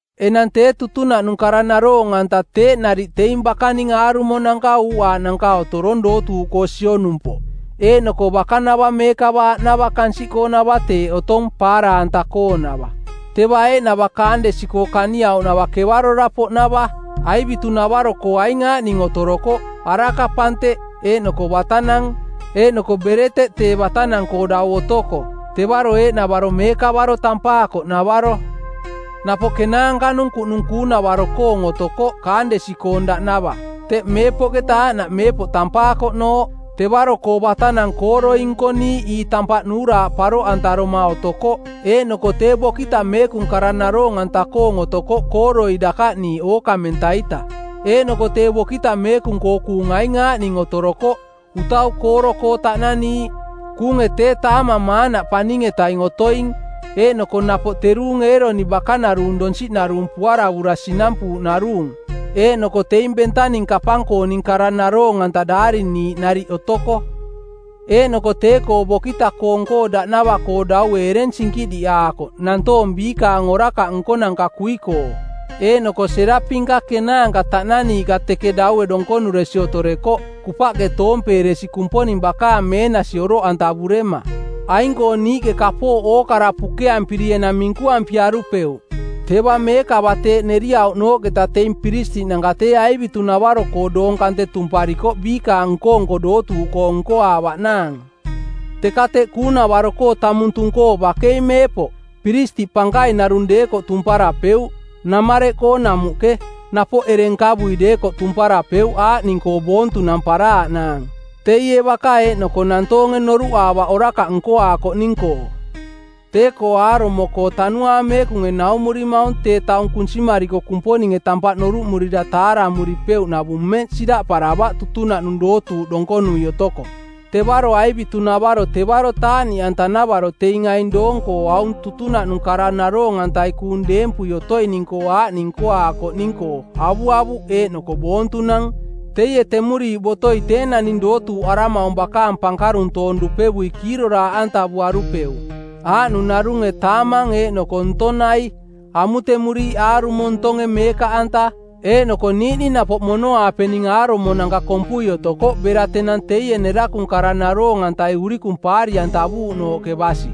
Enang tee tutunaꞌnung kara naroong-anta teeꞌ nariꞌ teing bakaning aarumonanka uuꞌaaꞌnanka otorong dootuuꞌkoo sionumpoꞌ, eeꞌnoko bakanava meekava aꞌnava kansiꞌkoonava teeꞌ otong, paara-anta-koonava. Teva eeꞌnava kaandesi-koo kaniauꞌnava kevarora-poꞌnava. Aivitunavaro-koo aing aaꞌning otorokoꞌ: araka-panteꞌ, eeꞌnoko batanang, eeꞌnoko bereteꞌ tee batanang-koo dau otoko. Tevaro eeꞌnavaro Meekavaro tampaakoꞌnavaro. Napoꞌ kenaanka-nung kuꞌnung kuunavaro-koong otokoꞌ kaandesi-koong daꞌnava, teꞌ Meepoꞌketa Aaꞌnaꞌ Meepoꞌ tampaakoꞌnooꞌ. Tevaro-koo batanang kooroi nkoniiꞌ ii tampaꞌ nuuraaꞌ paroꞌantaroma otokoꞌ eeꞌnoko tee bokita meekung kara naroong-anta-koong otokoꞌ kooroi dakaꞌniiꞌ ookamenta-ita. Eeꞌnoko tee bokita meekung-koo kuung aing aaꞌning otoroko: utau kooro-koo taꞌnaniiꞌ, kuunge tee taamang maanaꞌ paning-etaing otoing; eeꞌnoko napoꞌ teruung Eeroni bakanaruung donsiꞌnaruung puaravura sinampuuꞌnaruung, eeꞌnoko teing bentaning kapang-kooning kara naroong-anta daariniiꞌ nariꞌ otoko. Eeꞌnoko tee-koo bokita-koong-koo daꞌnava-koo daue ereng sinkiꞌdiꞌaakoꞌ nantoong biikaang orakaꞌ nkonanka kui-koo. Eeꞌnoko seraping-ka kenaanka taꞌnaniiꞌka teke daue donkonuresi otorekoꞌ, kupaꞌke toompeeresi Kumponing bakaang meenasi oroꞌantavurema. Aing-koo niiꞌke kapooꞌ ookara pukeampiri enang minkuampiarupeuꞌ. Teva meekava teeꞌ neriauꞌnooꞌketa teing piristiꞌnanka tee aivitunavaro-koo doong kante tumparikoꞌ biikaang nko-nko dootuuꞌkoong nkoaavaꞌnaang. Teka teꞌ kuunavaro tamung tung-koo bakei meepoꞌ, piristiꞌ pankaing narung deekoꞌ tumparapeuꞌ, namareꞌkoo namuꞌke, napoꞌ ereng nkavui deekoꞌ tumparapeuꞌ aaꞌning-koo boontunamparaaꞌnaang: teie baka eeꞌnoko nantoonge noruꞌaavaꞌ orakaꞌ nkoaakoꞌning-koo. Tee-koo aarumo-koo Tanuaang Meekunge naumurimaung tee taung kunsimariko Kumponinge tampaꞌ noruꞌmurira taaramuripeuꞌnavung mmeꞌ siraꞌparavaꞌ tutunaꞌnung dootuuꞌ donkonui otoko. Tevaro aivitunavaro tevaro taaꞌniꞌanta-navaro teing aing doong-koo aung tutunaꞌnung kara naroong-antai kuung deempui otoining-koo aaꞌning nkoaakoꞌning-koo avuavuꞌ eeꞌnoko boontunang; Teie temuriiꞌ botoi tee naning dootuuꞌaramaung bakaang pankaruntoong dupevui kiiroraaꞌantavuarupeuꞌ, aaꞌnung narunge taamang eeꞌnoko ntong nai, amutemuriiꞌ aarumo ntonge meekaꞌanta, eeꞌnoko niiꞌning napoꞌ mono-aapening aarumonanka kompui otokoꞌ bera tenang teie nerakung kara naroong-antai urikung paari-antavuuꞌnooꞌke basi.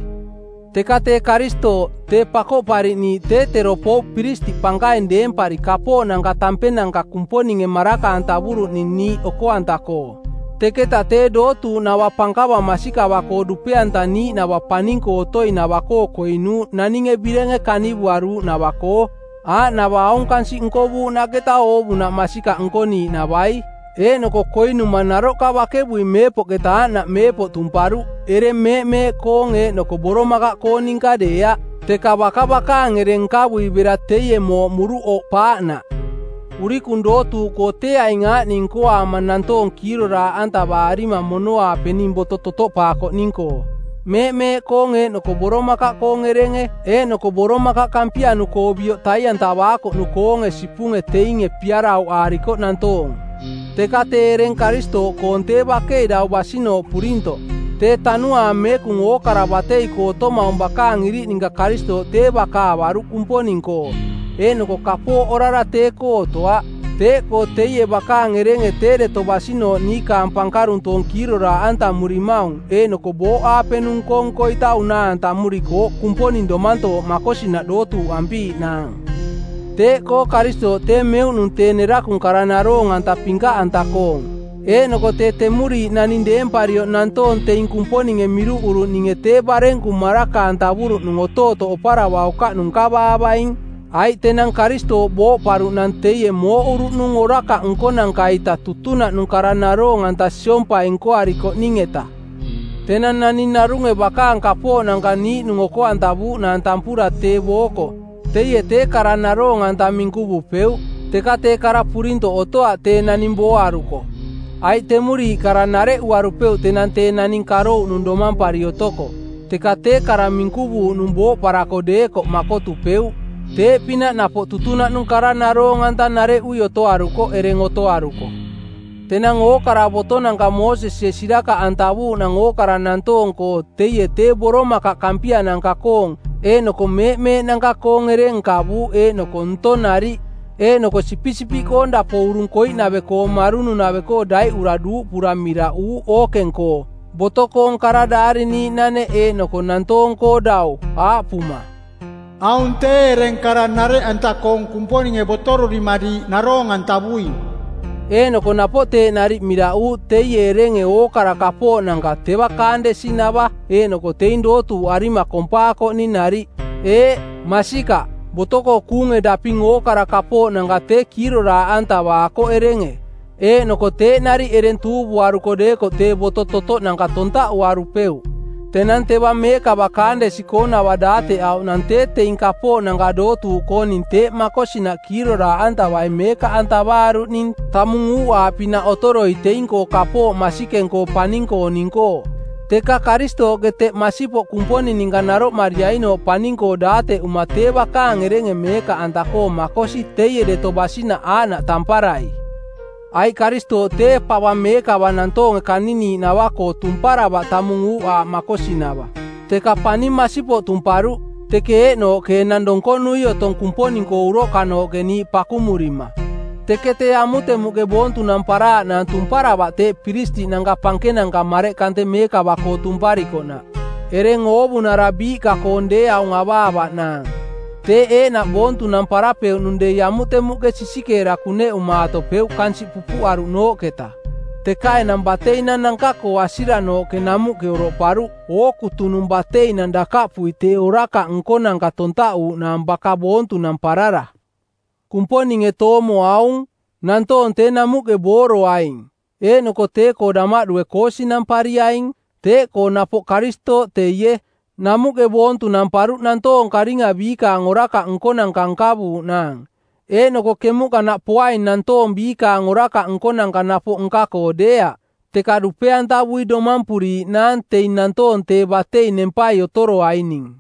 Teka tee Karistooꞌ, tee Pakoꞌpariꞌniiꞌ, tee tero pouꞌ piristiꞌ pankaing deempari kapooꞌnanka tampenanka Kumponinge maraka-antavuruꞌning niiꞌ oko-anta-koo. Teketa tee dootuuꞌnava pankava masikava-koo dupe-antaniiꞌnava paning-koo otoinava-koo koinuuꞌ naninge birenge kanivuaruuꞌnava-koo, aaꞌnava aung kansiꞌ nkovuuꞌnaꞌketa oovunaꞌ masikaꞌ nkoniiꞌnavai. Eeꞌnoko koinuma naroꞌka bakevui Meepoꞌketa Aaꞌnaꞌ Meepoꞌ tumparuꞌ ereng meeꞌmeeꞌkoong eeꞌnoko boromakaꞌkoong ninka deeaꞌ, teka baka bakaang ereng nkavui bera teie mooꞌmuruꞌ oꞌpaaꞌnaꞌ. Urikung dootuuꞌkoo tee aing aaꞌning nkoaama nantoong kiiroraaꞌantavaarima mono-aapening boto totoꞌpaakoꞌning-koo: meeꞌmeeꞌkoong eeꞌnoko boromakaꞌkoong erenge eeꞌnoko boromakaꞌ kampianu-koo bioꞌ tai-antavaakoꞌnu-koonge sipunge teinge piarauꞌaarikoꞌ nantoong. Teka tee ereng Karistooꞌkoong tee bakei dau basinooꞌ purintoꞌ. Tee Tanuaang Meekung ookara batei-koo otomaung bakaang iriꞌ ninka Karistooꞌ tee baka avaruꞌ Kumponing-koo, eeꞌnoko kapooꞌ orara tee-koo otoaꞌ. Teeꞌkoo teie bakaang erenge tee deto basinooꞌ niikaang pankaruntoong kiiroraaꞌantamurimaung eeꞌnoko booꞌaapenung nko-nko-ita unaa-antamurikooꞌ Kumponing domantooꞌ makosinaꞌ dootuuꞌampiiꞌnaang. Teeꞌkoo Karistooꞌ tee meuꞌnung tee nerakung kara naroong-anta pinkaꞌanta-koong, eeꞌnoko tee temuriiꞌ naning deemparioꞌ nantoong teing Kumponinge miruꞌuruꞌninge tee barenku maraka-antavuruꞌnung otootoꞌ oparavaukaꞌnung nkavaavaing, aiꞌ tenang Karistooꞌ booꞌparuꞌnang teie mooꞌuruꞌnung orakaꞌ nkonanka-ita tutunaꞌnung kara naroong-anta siompai nkoarikoꞌning-eta. Tenang naning narunge bakaang kapooꞌnanka niiꞌnung oko-antavuuꞌnaang tampura tee booko, teie tee kara naroong-anta minkuvupeuꞌ, teka tee kara purintoꞌ otoaꞌ tee naning booaruko. Aiꞌ temuriiꞌ kara nareꞌuarupeuꞌ tenang tee naning karouꞌnung domampari otoko. Teka tee kara minkuvuuꞌnung booꞌparako deekoꞌ makotupeuꞌ. Tee-pinaꞌ napoꞌ tutunaꞌnung kara naroong-anta nareꞌui otoarukoꞌ ereng otoaruko. Tenang ookara botonanka Moosesie sirakaꞌantavuuꞌnang ookara nantoong-koo teie tee boromakaꞌ kampia-nanka-koong eeꞌnoko meeꞌmeeꞌnanka-koong ereng nkavuuꞌ eeꞌnoko ntong nariꞌ; Eeꞌnoko sipisipiꞌkoong dapo urung koiꞌnave-koo marununave-koo daiꞌura duuꞌpura miraꞌuuꞌ ookeng-koo, boto-koong kara daariniiꞌnaneꞌ eeꞌnoko nantoong-koo dau, aaꞌpuma, “Aung tee ereng kara nareꞌanta-koong Kumponinge botorurima diiꞌ naroong-antavuing.” Eeꞌnoko napoꞌ teeꞌ nariꞌ miraꞌuuꞌ teie erenge ookara kapooꞌnanka teva kaandesinava eeꞌnoko teing dootuuꞌarima kompaakoꞌning nariꞌ. Eeꞌ, masikaꞌ, boto-koo kuunge daping ookara kapooꞌnanka tee kiiroraaꞌantavaakoꞌ erenge, eeꞌnoko teeꞌ nariꞌ ereng tuuvuaruko deekoꞌ tee boto totoꞌnanka tontaꞌuarupeuꞌ. Tenang teva meekava kaandesi-koonava daateꞌauꞌnang tee teing kapooꞌnanka dootuuꞌkooning teeꞌ makosinaꞌ kiiroraaꞌantavai meekaꞌantavaaruꞌning tamung uuꞌaaꞌpinaꞌ otoroi teing-koo kapooꞌ masikeng-koo paning-kooning-koo. Teka Karistooꞌke teꞌ masipoꞌ Kumponing ninka naroꞌmariainooꞌ paning-koo daateꞌuma tee bakaang erenge meekaꞌanta-koo makosi teie deto basinaꞌ aaꞌnaꞌ tamparai. Aiꞌ Karistooꞌ tee pava meekava nantoonge kaniniiꞌnava-koo tumparavaꞌ tamung uuꞌaaꞌ makosinava, teka paning masipoꞌ tumparuꞌ, teke eeꞌnooꞌke enang donkonui otong Kumponing-koo uroꞌkanooꞌke niiꞌ pakumurima. Teke tee amutemuꞌke boontunamparaaꞌnaang tumparavaꞌ teeꞌ piristiꞌnanka pankenanka mareꞌ kante meekava-koo tumparikoꞌnaꞌ ereng oovunara biiꞌka-koong deeaung avaavaꞌnaang. Teeꞌ eeꞌnaꞌ boontunamparapeuꞌnung dei amutemuꞌke sisikeera kuneꞌumaatopeuꞌ kansiꞌ pupuꞌaruꞌnooꞌketa, teka enang bateinang-nanka-koo asiranooꞌke namuꞌke oroꞌparuꞌ ookutunung bateinang dakaꞌpui tee orakaꞌ nkonanka tontaꞌuuꞌnaang baka boontunamparara. Kumponinge toomo aung: Nantoong tee namuꞌke booroaing eeꞌnoko tee-koo damaꞌdue koosinampariaing. Teeꞌkoo napoꞌ Karistooꞌ teie, namuꞌke boontunamparuꞌ nantoong karinga biikaang orakaꞌ nkonanka nkavuuꞌnaang, eeꞌnoko kemuꞌkanaꞌ poaing nantoong biikaang orakaꞌ nkonanka napoꞌ nka-koo deeaꞌ, teka dupe-antavui domampuriiꞌnaang teing nantoong tee batei nempai otoroaining.